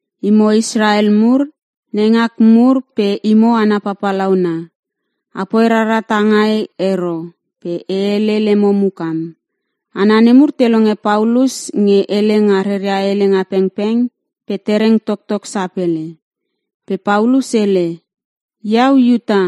“Imo Israel mur, neingak mur pe imo hana papalauna. Apoi rara tangai ero pe e hele lemo mukam.” Hana nemur te longe Paulus nge hele nga ria helenga pengpeng pe tereng toktok sapele. Pe Paulus hele, “Iau Iuta,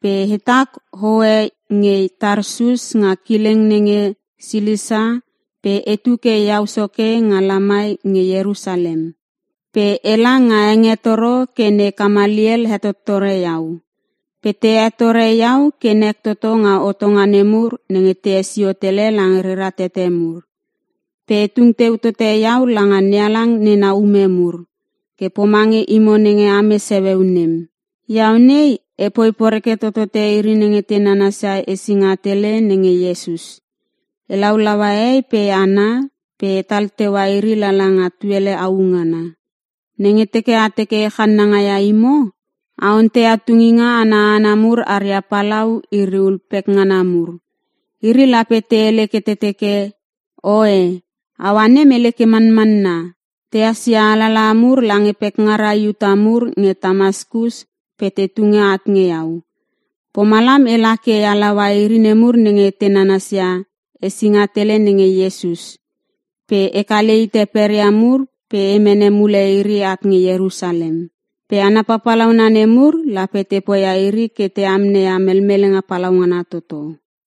pe hetak hohe nge Tarsus nga kileng nenge Silisia pe etu ke iau soke nga lamai nge Ierusalem. Pe ela nga hengetoro ke ne Kamaliel hetottore iau. Pe te hetore iau ke nek toto nga hotonga nemur nenge te hesio tele lange rera tete mur. Pe e tung teu tote iau langa NeHalang nena ume mur, ke pomange imo nenge ames heueu nem. Iau nei epoi poreke totote iri nenge te nanasia Esinga Tele nenge Iesus. E laulaua hehei pe hana pe etal teua iri lala nga tuele au ngana. Nenge teke a teke e channanga ia imo, a onteia tunginga ana hana mur aria palau iri ul pekngana mur. Iri lape te hele ke te teke, ‘Oe aua nem hele ke manmanna.’ Tehas ia alalaha mur lange pekngara Iuta mur nge Tamaskus pe te tunge at nge iau. Pomalam ela ke e laua iri nemur nenge te nanasia Esinga Tele nenge Iesus, pe e kale hite peria mur pe e mene mule iri at nge Ierusalem. Pe hana papalauna nemur lape te poia iri ke te amneia melmelenga palaungana toto.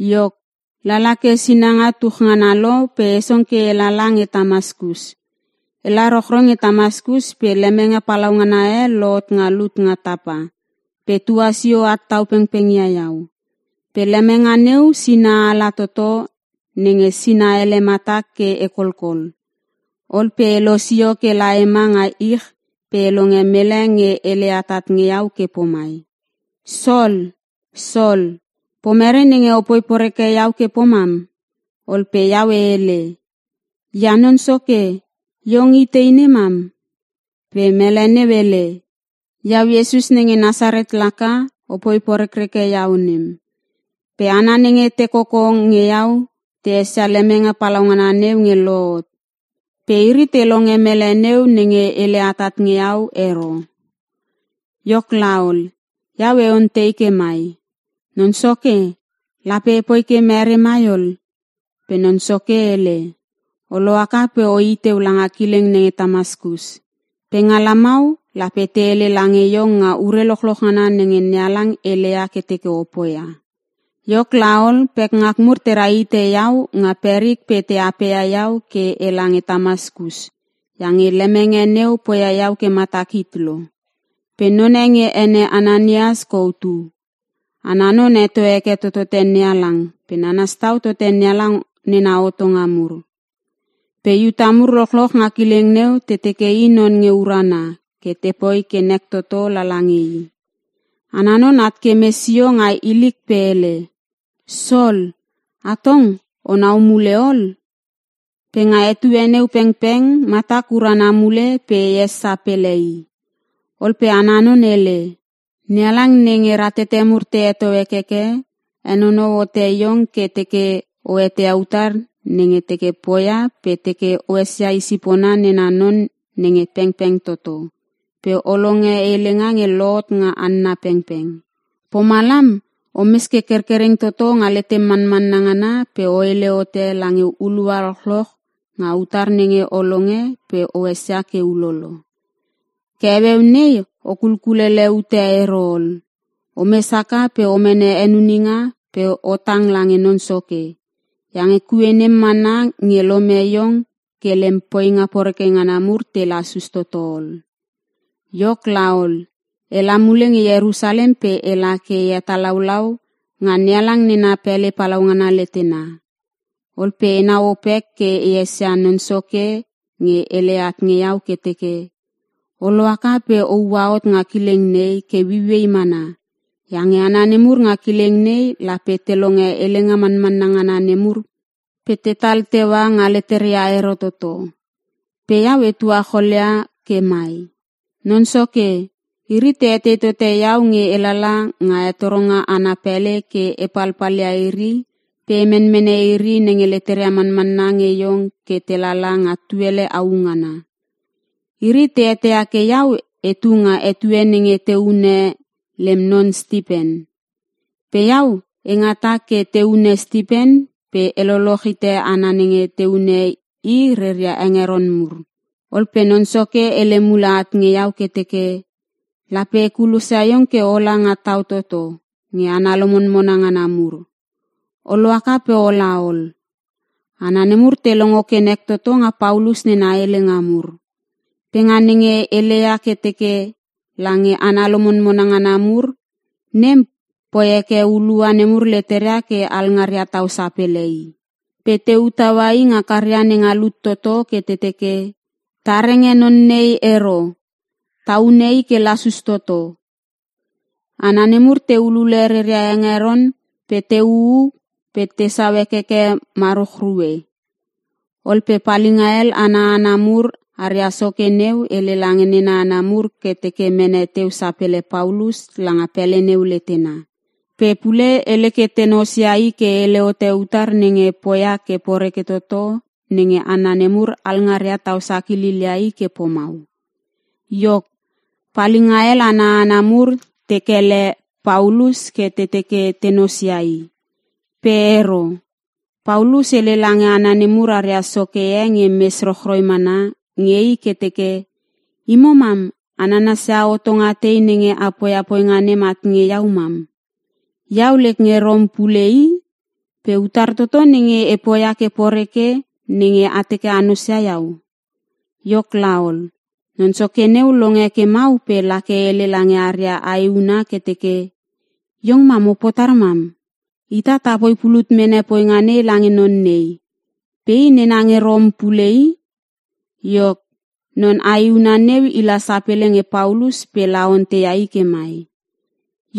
“Iok lala ke sinanga tuch ngana lo pe e song ke e lala nge Tamaskus. Ela rochroi nge Tamaskus pe lemenge palaungana e lohot nga lut nga tapa pe tuasio at tau pengpeng ia iau. Pe lemenge neu sina ala toto nenge sina ele matak ke e kolkol. Ol pe elosio ke la ema nga ich pe e longe mele nge hele atat nge iau ke pomai, ‘Sol, Sol, pomere nenge opoi poreke iau ke pomam?’ “Ol pe iau e hele, ‘Ia Non Soke, iong itei nemam?’ “Pe mele neu hele, ‘Iau Iesus nenge Nasaret laka opoi porekreke iau nem.’ Pe hana nenge te koko nge iau te esia lemenge palaungana neu nge lohot. Pe iri te longe mele neu nenge hele atat nge iau ero. “Iok laol, iau e ontei ke mai, ‘Non Soke, lape epoi ke mere mai ol?’ “Pe Non Soke hele, ‘O lohaka pe o i teu langa kileng nenge Tamaskus. Pe nga lamau lape te hele lange iong nga ure lochloch ngana nenge NeHalang heleia ke teke o poia.’ Iok laol, pekngak mur tera hite iau nga perik pe te apeia iau ke e lange Tamaskus iange lemenge neu poia iau ke matak hit lo. “Pe none nge ene Ananias kou tu. Ana non heto heke totote NeHalang pe nanas tau tote nena hotonga mur. Pe Iuta mur lochloch nga kileng neu te teke i non nge urana ke tepoi ke nek toto lala nge i. Ana non at ke mes sio nga ilik pe hele, ‘Sol, atong onau mule ol! Pe nga etue neu pengpeng matak urana mule pe e es sapele i.’ Ol pe ana non hele, ‘NeHalang nenge ratete mur te heto hekeke, henonou hote iong ke teke o eteia utar nenge teke poia pe teke o esia i sipona nena non nenge pengpeng toto pe o longe helenga nge lohot nga hanna pengpeng. Pomalam omes ke kerkereng toto nga letem manmanna ngana pe o hele hote lange hulua lochloch nga utar nenge o longe pe o esia ke ulolo. Ke heueu nei o kulkulele ute ero ol. Omes haka pe o mene henuninga pe o tang lange Non Soke. Iange kue nem mana nge lome iong ke lem poinga poreke ngana mur te lasus toto ol.’ “Iok laol, e la mule nge Ierusalem pe ela ke e hetalaulau nga NeHalang nena pele palaungana letena. Ol pe enau opek ke e esia Non Soke nge hele at nge iau ke teke, ‘O lohaka pe o ua hot nga kileng nei ke ueiuei mana iange hana nemur nga kileng nei lape te longe helenga manmanna ngana nemur pe tetal teua nga leteria ero toto.’ Pe iau e tuacholia ke mai, ‘Non Soke, iri te etei tote iau nge elala nga hetoronga ana pele ke e palpalia iri pe e menmene iri nenge leteria manmanna nge iong ke te lala nga tuele au ngana. Iri te eteia ke iau etu nga etue nenge te hune lem non Stipen. Pe iau e ngata ke te hune Stipen pe e loloch hite hana nenge te hune i reria hengeron mur.’ Ol pe Non Soke hele mule at nge iau ke teke, ‘Lape e kulosia iong ke ola nga tau toto nge hana lomonmona ngana mur. O lohaka pe o laol.’” Hana nemur te longo ke nek toto nga Paulus nena helenga mur. Pe nga nenge heleia ke teke lange hana lomonmona ngana mur, nem poi heke hulua nemur leteria ke alngaria tau sapele i. Pe te u taua i nga karia nenga lut toto ke te teke, “Ta renge non nei ero! Ta hune i ke lasus toto!” Hana nemur te ulule reria hengeron pe te uu pe tesau hekeke maruchrue. Ol pe palinga hel ana hana mur aria soke neu hele lange nena hana mur ke te mene teu sapele Paulus langa pele neu letena. Pe pule hele ke te nosia i ke hele hote utar nenge poia ke poreke toto nenge hana nemur alngaria tau sakililia i ke pomau. Iok, palinga hel ana hana mur te kele Paulus ke te teke te nosia i. Pe ero. Paulus hele lange hana nemur aria soke e nge mes rochroi mana nge i ke teke, “Imo mam a nanasia hotonga tei nenge a poia poinga nem at nge iau mam? Iau lek nge Rom pule i. Pe utar toto nenge e poia ke poreke, nenge a teke a nosia iau?” Iok laol, non soke neu longe ke mau pe lake hele lange aria aehuna ke teke, “Iong mam opotar mam? Ita tapoi pulut mene poinga nei lange non nei. Pe i nena nge Rom pule i!” Iok non aehuna neu i la sapele nge Paulus pe la onteia i ke mai,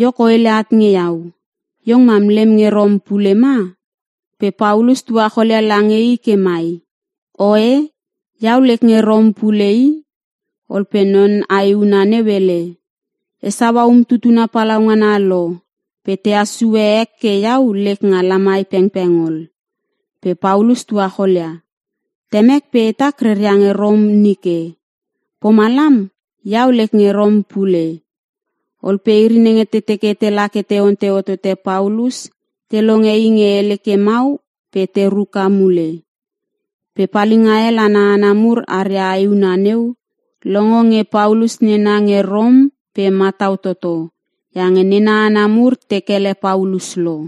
“Iok o hele at nge iau, iong mam lem nge Rom pule ma?” Pe Paulus tuacholia lange i ke mai, “Oe! Iau lek nge Rom pule i!” Ol pe non aehuna neu hele, “E saua umtutuna palaungana lo pe tahas sue ek ke iau lek nga lamai pengpeng ol.” Pe Paulus tuacholia, “Temek pe hetak reria nge Rom nike, pomalam iau lek nge Rom pule.” Ol pe iri nenge te teke tela ke te ontei hotote Paulus te longe i nge hele ke mau pe te ruka mule. Pe palinga hel ana hana mur aria aehuna neu longo nge Paulus nena nge Rom pe matau toto iange nena hana mur te kele Paulus lo.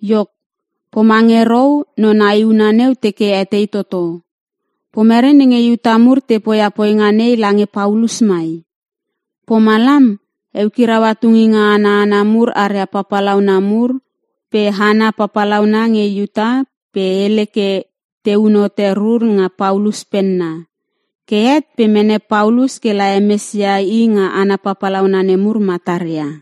Iok, pomange rou non aehuna neu teke etei toto; Pomere nenge Iuta mur te poia poinga nei lange Paulus mai? Pomalam eukiraua tunginga ana hana mur aria papalauna mur pe hana papalauna nge Iuta pe hele ke teun hote rur nga Paulus penna. Ke het pe mene Paulus ke la hemesia i nga hana papalauna nemur mataria.